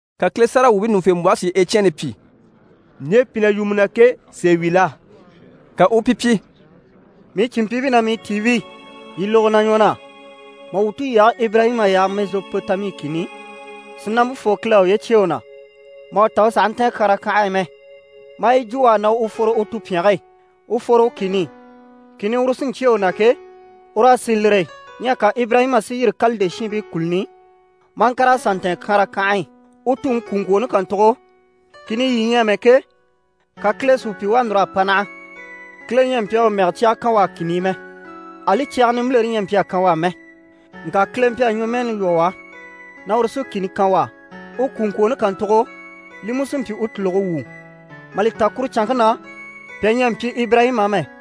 Ka Kile sáragawwuubii ɲùŋufembwɔhe si Ecyɛni pyi: «Ɲje pi na yu mu na ke, sèe wi la?» Ka u u pi pyi: «Mii cìnmpyiibii ná mii tiibii, yii lógo na ɲwɔ na. Mà wuu tulyage Ibirayima yaha Mɛzopotami kìni i, sìnampe fooŋi Kile à uye cyêe u na mà u ta u sàha ntɛ̀ɛn Kyaran kànhe e mɛ. Maa yi jwo u á na u fworo u tupyɛnge e, u fworo u kìni i, kìni uru sí n‑cyêe u na ke, u raa sì lire e. Ɲyɛ ka Ibirayima si yîri Kalide shiinbii kùluni i, maa ŋkàr'a sà ntɛ̀ɛn Kyaran kànhe e. U tuŋi kwùŋkwooni kàntugo, kìni i yii ɲyɛ amɛ ke, ka Kile si u pyi u à núr'a pa naha. Kile ɲyɛ a mpyi a u mɛgɛ cyaga kan u á kìni i mɛ, ali cyaga nimbilere ɲyɛ a mpyi a kan u á mɛ. Ŋka Kile mpyi a ɲwɔmɛɛni lwɔ́ u á na uru sí kìni kan u á, u kwùŋkwooni kàntugo, li mú sí n‑pyi u tùluge wuu, mà li ta kuru canŋke na, pyà ɲyɛ a mpyi Ibirayima á mɛ.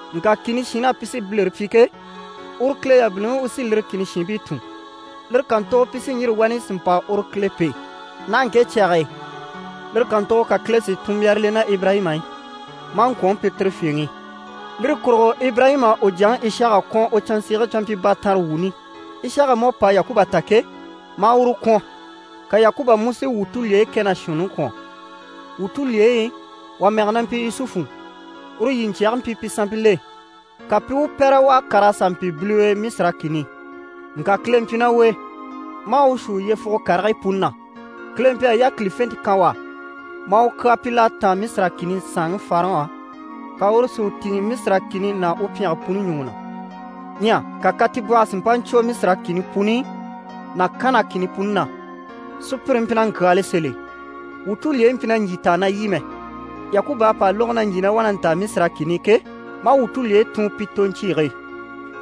Ŋka kìni shiinbil'á pi sí bilere pyi ke, uru Kile yabiliŋi u sí lire kìni shiinbii tùn. Lire kàntugo pi sí n‑yîri wani si mpa uru Kile pêe naha ŋke cyage e. Lire kàntugo ka Kile si tunmbyara le ná Ibirayima e, maa ŋkwɔ̀nŋi pyi tire fyèŋi. Lire kurugo Ibirayima à u jyaŋi Ishaka kwɔ̀n u canzege canmpyibaatanrewuuni. Ishaka mú à pa Yakuba ta ke, maa uru kwɔ̀n, ka Yakuba mú si wuu tulyeyi kɛ ná shuunniŋi kwɔ̀n. Wuu tulyeyi i, wà mɛge na mpyi Yusufu, uru yiɲcyɛge mpyi pi sanmpil'e, ka pi i u pɛ́rɛ, u à kàr'a sà mpyi biliwe Misira kìni i. Ŋka Kile mpyi ná u e, maa u shuu yyefuge karigii puni na. Kile mpyi a yákilifente kan u á, maa u kyaa pyi l'à táan Misira kìni saanŋi Farɔn á, ka uru si u tìŋɛ Misira kìni ná u pyɛnge puni ɲùŋɔ na. Ɲyɛ ka katibwɔhɔ si mpa ɲcwo Misira kìni puni ná Kana kìni puni na. Sùpyire mpyi na ŋkyaali sèl'e. Wuu tulyeyi mpyi na ɲjyì taa na lyî mɛ. Yakuba à pa lógo na ɲjyì na wá na ntaa Misira kìni i ke, maa wuu tulyeyi tun pi toɲcyiige e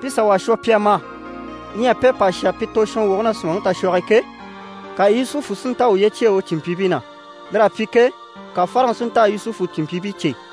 pi sà wà shwɔ, pi a ma. Ɲyɛ pi à pa shà pi tozhɔnwoge na sùmaŋi tashwɔge e ke, ka Yusufu si nta a uye cyêe u cìnmpyiibii na. Lir'à pyi ke, ka Farɔn si nta a Yusufu cìnmpyiibii cè.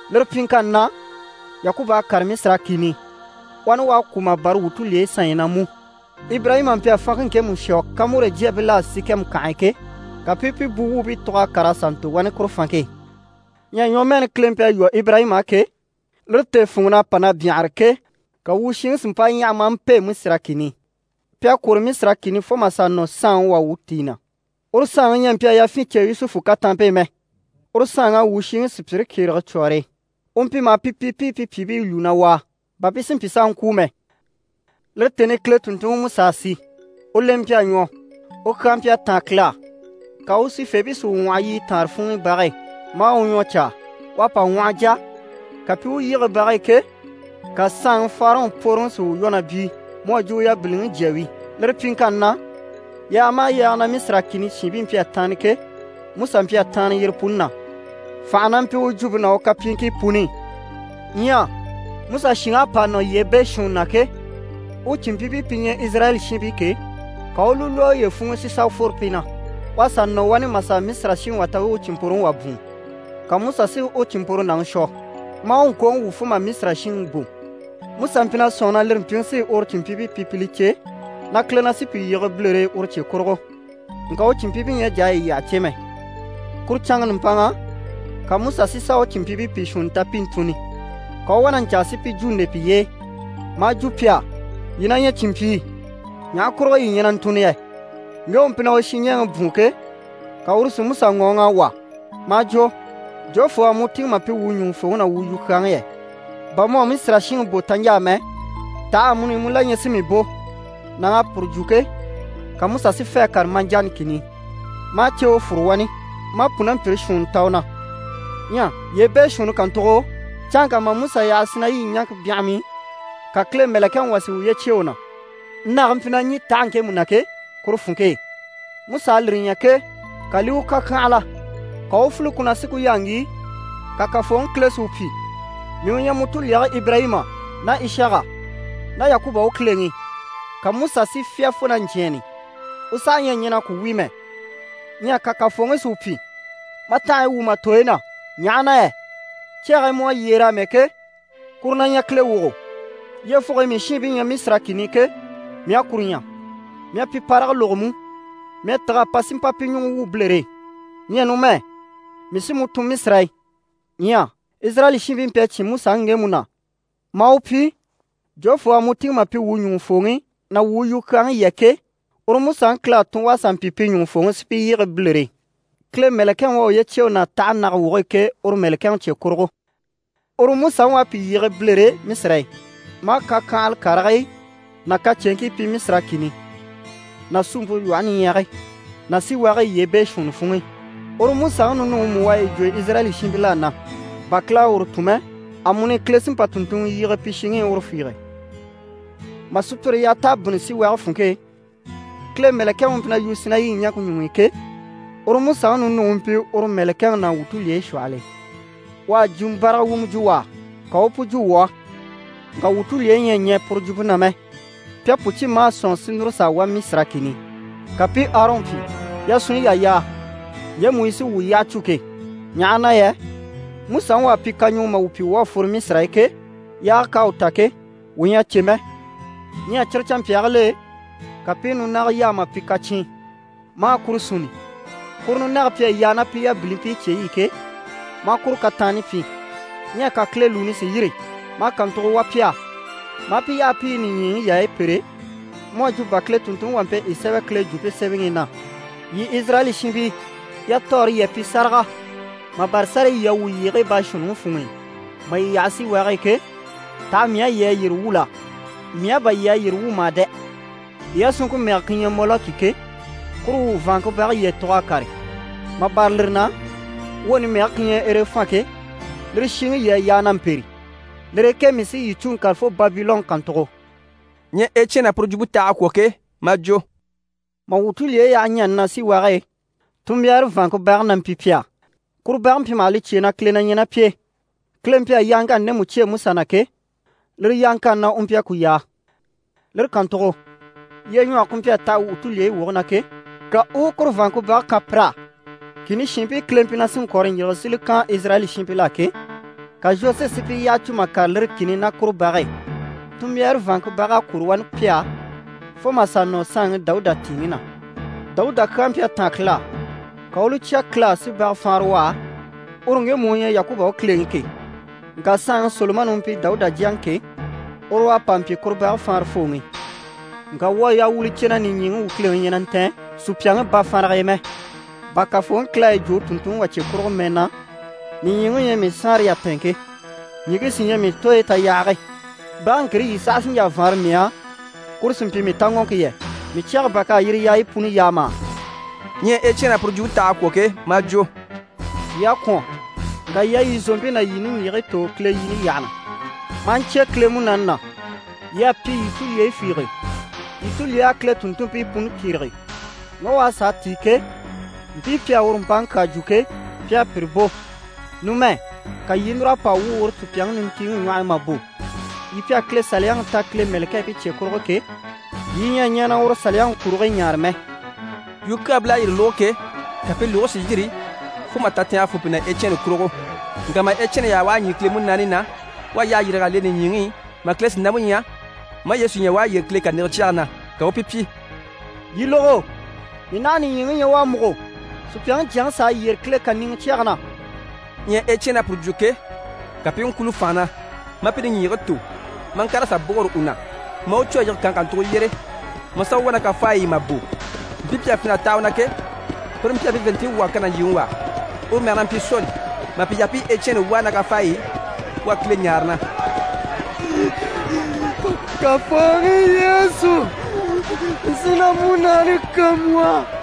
Lire pyiŋkanni na, Yakuba à kàre Misira kìni i. Wani u à kwû, mà bâra wuu tulyeyi sanɲyi na mú. Ibirayima mpyi a fanŋke ŋkemu shwɔ Kyamɔri jyaabil'á Sikɛmu kànhe e ke, ka pi i pi buwuubii tug'a kàr'a sà ntò wani kuru fanŋke e. Ɲyɛ ɲwɔmɛɛni Kile mpyi a lwɔ́ Ibirayima á ke, lire tèefunŋɔn'à pa na byanhare ke, ka wuu shiŋi si mpa ɲyaha maa mpêe Misira kìni i. Pi à kwôro Misira kìni i fo mà sà nɔ saanŋi wà u tìi na. Uru saanŋi ɲyɛ a mpyi a yafyin cè Yusufu kataanmpe e mɛ. Uru saanŋ'à wuu shiŋi sùpyire kyérege cwɔ̀ɔre e. U mpyi maha pi pyi pi i pi pyìibii lwúu na wàa, bà pi si mpyi s'a ŋkwûu mɛ. Lire tèni i Kile tùnntunŋiMusa à si. U lemɛ mpyi a ɲwɔ, u kyaa mpyi a táan Kile á, ka u sifeebii si u ŋwɔhɔ yiɲyɛ taanre funŋ'i bage e maa u ɲwɔ caa. U à pa ŋwɔhɔ jà, ka pi i u yige bage e ke, ka saanŋi Farɔn pworoŋi si u lwɔ́ na byíi mu à jwo u yabiliŋi jya wi. Lire pyiŋkanni na, yaaga maha yaaga na Misira kìni shiinbii mpyi a taanna ke, Musa mpyi a taanna yire puni na. Fànhe na mpyi u jwumpe ná u kapyiiŋkii puni i. Ɲyɛ Musa shìŋ'à pa nɔ yyee beeshuunni na ke, u cìnmpyiibii pi ɲyɛ Izirayɛli shiinbii ke, ka u u li lwɔ́ uye funŋ'i si sà fworo pi na. U à sà nɔ wani mà sà Misira shinŋi wà ta u u u cìnmpworoŋi wà bwùun, ka Musa si u cìnmpworonaŋi shwɔ maa u ŋkooŋi wwû fo mà Misira shinŋi bò. Musa mpyi na sɔ̂nŋi na lire mpyiŋi sí uru cìnmpyiibii pyi pi li cè na Kile na sí pi yige bilere e uru cye kurugo, ŋka u cìnmpyiibii ɲyɛ a jà a yi yyaha cè mɛ. Kuru canŋa nùmpanŋa, ka Musa si sà u cìnmpyiibii pìi shuunni ta pi i ntùnni, ka u u wá na ɲcaa si pi jwo nde piye e maa jwo pi á “Yii na ɲyɛ cìnmpyii, ɲaha kurugo yii ɲyɛ na ntùnni yɛ?” Ŋge u mpyi na u shinɲɛɛŋi bwùun ke, ka uru si Musa ŋɔɔŋ'a wà maa jwo: “Jofoo u à mu tìŋɛ mà pyi wuu ɲùŋufooŋi ná wuu yukyaaŋi yɛ? Bà mu à Misira shinŋi bò taɲjaa mɛ, taha amuni mu la ɲyɛ si mii bò?” Nàŋ'à puru jwo ke, ka Musa si fê a kàre Madiyani kìni i. Maa ceewe fúru wani maa pùnampyire shuunni ta u na. Ɲyɛ yyee beeshuunni kàntugo, canŋka mà Musa yaha Sinayi ɲaŋke byanham'i, ka Kile mɛ̀lɛkɛŋi wà si uye cyêe u na, nage mpyi na ɲî tahe ŋkemu na ke, kuru funŋke e. Musa à lire ɲya ke, ka li i u kàkyanhala. Ka u u file ku na si ku yaa ŋgíi, ka Kafooŋi Kile si u pyi “Mii u ɲyɛ mu tulyeyi Ibirayima ná Ishaka ná Yakuba u Kileŋi.” Ka Musa si fyá fo na ɲcyɛ̂ɛnni, u saha ɲyɛ a ɲɛn'a ku wíi mɛ. Ɲyɛ ka Kafooŋi si u pyi “Ma tanhaɲyi wwû ma tooyi na, ɲaha na yɛ cyage e mu à yyére amɛ ke, kuru na ɲyɛ Kile wogo. Yyefuge e mii shiinbii ɲyɛ Misira kìni i ke, mii à kuru ɲya, mii à pi parage lógo mú. Mii à tîg'a pa si mpa pi ɲùŋɔ wwû bilere e. Ɲyɛ numɛ, mii sí mu tun Misira e.” Ɲyɛ Izirayɛli shiinbii mpyi a cyé Musaŋi ŋgemu na, maa u pyi “Jofoo u à mu tìŋɛ mà pyi wuu ɲùŋufooŋi ná wuu yukyaaŋi yɛ?” ke, uru Musaŋi Kile à tun u à sà mpyi pi ɲùŋufooŋi, si pi yige bilere e, Kile mɛ̀lɛkɛŋi u à uye cyêe u na tahe nage woge e ke, uru mɛ̀lɛkɛŋi cye kurugo. Uru Musaŋi u à pi yige bilere e Misira e, maa kakyanhala karigii ná kacyeeŋkii pyi Misira kìni ná Suumpe Lwɔhe Niɲyage ná síwage e yyee beeshuunni funŋ'i. Uru Musaŋi ninuŋi mú u à yi jwo Izirayɛli shiinbil'á na, bà Kile à uru tun mɛ, amuni Kile sí n‑pa tùnntunŋɔ yige pi shiŋi i uru fiige. Mà sùpyire yaha t'à bínni síwage funŋke e, Kile Mɛlɛkɛŋi u mpyi na yu Sinayi ɲaŋke ɲuŋ'i ke, uru Musaŋi ninuŋi u mpyi uru Mɛlɛkɛŋi ná wuu tulyeyi shwɔhɔl'e. U à jwumɔ báraga wumɔ jwo u á, ka u u pu jwo wuu á. Ŋka wuu tulyeyi ɲyɛ a ɲɛɛ puru jwumpe na mɛ, pi à pu cyé maa sɔ̂nŋi si núru s'a wá Misira kìni i. Ka pi i Arɔn pyi “Yasunɲyi yà yaa ɲjemu yi sí wuu yyaha cû ke, ɲaha na yɛ Musaŋi u à pyi kaɲuŋɔ mà wuu pyi wuu à fworo Misira e ke, yaage k'à u ta ke, wuu ɲyɛ a cè mɛ.” Ɲyɛ cyire canmpyaagil'e, ka pi i nunaga yaa mà pyi kacyiin, maa kuru sunni. Kuru nunage pi à yaa ná pi yabilimpii cyeyi i ke, maa kuru kataanni pyi. Ɲyɛ ka Kile lùuni si yîri, maa kàntugo wà pi á, maa pi yaha pi i nìɲyiŋi yaayi pêre mu à jwo bà Kile tùnntunŋi wà mpyi a yi sémɛ Kile Jwumpe Semɛŋi i na “Yii Izirayɛli shiinbii, yatɔɔre yii à pyi sáraga, mà bâra sárayi yii à wwû yyeegii beeshuunniŋi funŋ'i mà yii yaha síwage e ke, taha mii á yii à yire wwû la? Mii á bà yii à yire wwû mà dɛ! Yii yasunŋke mɛge ku ɲyɛ Mɔlɔki ke, kuru u vàanŋke bage yii à tug'a kàre. Mà bâra lire na, woni mɛge ku ɲyɛ Erefan ke, lire shiŋi yii à yaa na mpêre. Lire e ke mii sí yii cû n‑kàre fo Babilɔn kàntugo.”» Ɲyɛ Ecyɛni à puru jwumpe taha a kwɔ̀ ke, maa jwo: «Mà wuu tulyeyi yaha ɲani na síwage e, tunmbyaare vàanŋke bage na mpyi pi á. Kuru bage mpyi maha li cyêe na Kile na ɲyɛ ná pi e. Kile mpyi a yaaŋkanni ndemu cyêe Musa na ke, lire yaaŋkanni na u mpyi a ku yaa. Lire kàntugo lyeɲwɔge ku mpyi a taha wuu tulyeyi woge na ke, ka u u kuru bage kan pir'á. Kìni shiinbii Kile mpyi na sí n-kɔ̀rɔ n-yige si li kan Izirayɛli shiinbil'á ke, ka Zhosuwe si pi yyaha cû mà kàre lire kìni i ná kuru bage e. Tunmbyaare vàanŋke bag'à kwôro wani pi á fo mà sà nɔ saanŋi Dawuda tìiŋi na. Dawuda kyaa mpyi a táan Kile á, ka u u li cya Kile á si baga faanra u á, uru ŋgemu u ɲyɛ Yakuba u Kileŋi ke. Ŋka saanŋi Solomani u mpyi Dawuda jyaŋi ke, uru u à pa mpyi kuru bage faanrafooŋi. Ŋka wuu à yaa wuu li cè na nìɲyiŋi u Kileŋi ɲyɛ na ntɛ̀n sùpyaŋi bafanrage e mɛ, bà Kafooŋi Kile à yi jwo u tùnntunŋi wà cye kurugo mɛ, na “Nìɲyiŋi u ɲyɛ mii saanre yatɛɛnŋke, ɲìŋke sí ɲyɛ mii tooyi tayahage. Bage ŋkire yii saha sí n‑jà n‑faanra mii á, kuru si mpyi mii taŋɔŋke yɛ? Mii cyɛge bà k'à yire yaayi puni yaa mà?”» Ɲyɛ Ecyɛni à puru jwumpe taha a kwɔ̀ ke, maa jwo: «Yii à kwɔ̀n, ŋka yii à yii zòompii ná yii niŋgyigigii tò Kile yini yyaha na, maa ɲcyé Kile Munaani na. Yii à pyi yii tulyeyi fiige. Yii tulyey'à Kile tùnntunmpii puni kyérege. Ŋge u à sàa tíi ke, mpii pi à uru mpaŋi kyaa jwo ke, pi à pire bò. Numɛ, ka yii i núr'a pa wwû uru sùpyaŋi nintiiŋi ɲwɔh'i mà bò. Yii pi à Kile Saliyaŋi ta Kile mɛ̀lɛkɛɛbii cye kurugo ke, yii ɲyɛ a ɲɛɛ na uru Saliyaŋi kurigii ɲaare mɛ.» Yukyaabil'à yire lógo ke, ka pi lùgigii si yîri fo mà tatɛɛnge fô pi na Ecyɛni kurugo. Ŋka mà Ecyɛni yaha u à ɲî Kile Munaani na, u à yyahe yîrig'a le nìɲyiŋi i, mà Kile sìnampe ɲya, maa Yesu ɲya u à yyére Kile kàniŋɛ cyɛge na, ka u u pi pyi: «Yii lógo, mii naha nìɲyiŋi ɲya u à múgo, Supyaŋi Jyaŋi s'à yyére Kile kàniŋɛ cyɛge na.» Ɲyɛ Ecyɛni à puru jwo ke, ka pi i ŋkwúulo fànha na, maa pi niŋgyigigii tò, maa ŋkàr'a sà bôgoro u na, maa u cû a yige kànhe kàntugo yyére, maa sà u wà ná kafaayi i mà bò. Mpii pi à fin'a taha u na ke, pire mpyi a pi vàanntinɲyi wwû a kan nàɲjiiŋi wà á, uru mɛge na mpyi Soli. Mà pi yaha pi i Ecyɛni wàa ná kafaayi i, u à Kile ɲáare na: «Kafooŋi Yesu, mii sí na múnaani kan mu á!»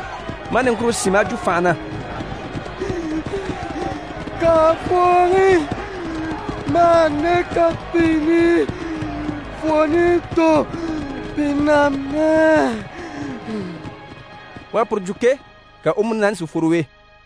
Maa niŋkure sín maa jwo fànha na: «Kafooŋi, ma hà nde kapiini fwooni tò pi na mɛ!» U à puru jwo ke, ka u múnaani si fworo u e.